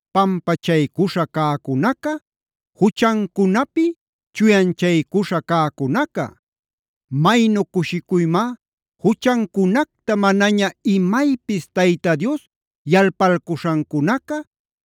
pampachaycuśha cäcunaca, juchancunapi chuyanchaycuśha cäcunaca. Maynu cushicuymá juchancunacta manaña imaypis Tayta Dios yalpalcuśhancunaca,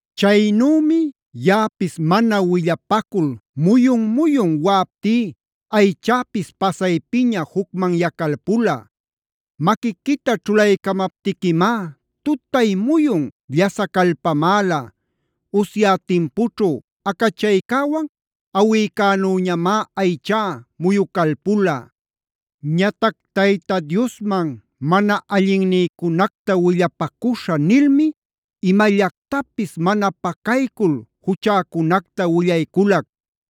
Chaynümi yaꞌapis mana willapacul muyun-muyun waꞌaptí aychäpis pasaypiña jucmanyacalpula. Maquiquita ćhulaycamaptiquimá tutay-muyun llasacalpamäla. Usya timpućhu acachaycäwan awïcänüñamá aychá muyucalpula. Ñatac “Tayta Diosman mana allinnïcunacta willapacuśhä” nilmi imallactapis mana pacaycul juchäcunacta willayculac.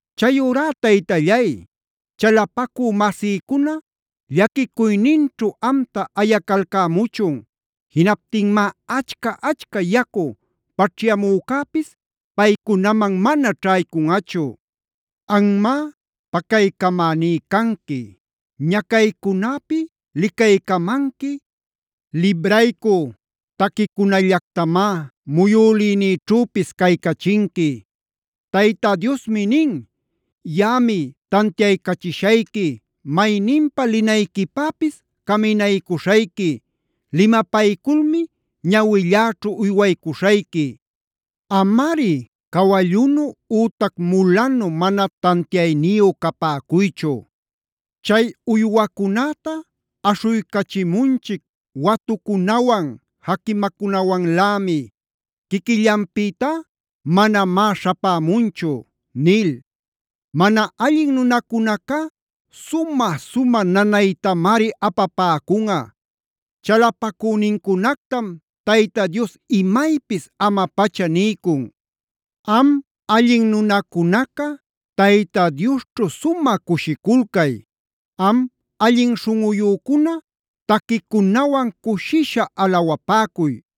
Chayurá Taytallay, chalapacü masïcuna llaquicuyninćhu amta ayacalcämuchun. Jinaptinmá achca-achca yacu paćhyamücäpis paycunaman mana ćhaycunꞌachu. Anmá pacaycamäní canqui. Ñacaycunäpi licaycamanqui, libraycü taquicunallactamá muyülïnïćhüpis caycachinqui. Tayta Diosmi nin: “Yaꞌami tantiaycachishayqui, mayninpa linayquipäpis caminaycuśhayqui, limapayculmi ñawilläćhu uywaycuśhayqui. Amari cawallunu ütac mulanu mana tantiayniyu capäcuychu; chay uywacunäta aśhuycachimunchic watucunawan jaquimacunawanlämi. Quiquillanpïtá manamá śhapämunchu” nil. Mana allin nunacunacá sumä-sumä nanaytamari apapäcunꞌa. Chalapacünincunactam Tayta Dios imaypis ama-pacha niycun. Am allin nunacunaca, Tayta Diosćhu sumä cushiculcay. Am allin śhunꞌuyücuna, taquicunawan cushisha alawapäcuy.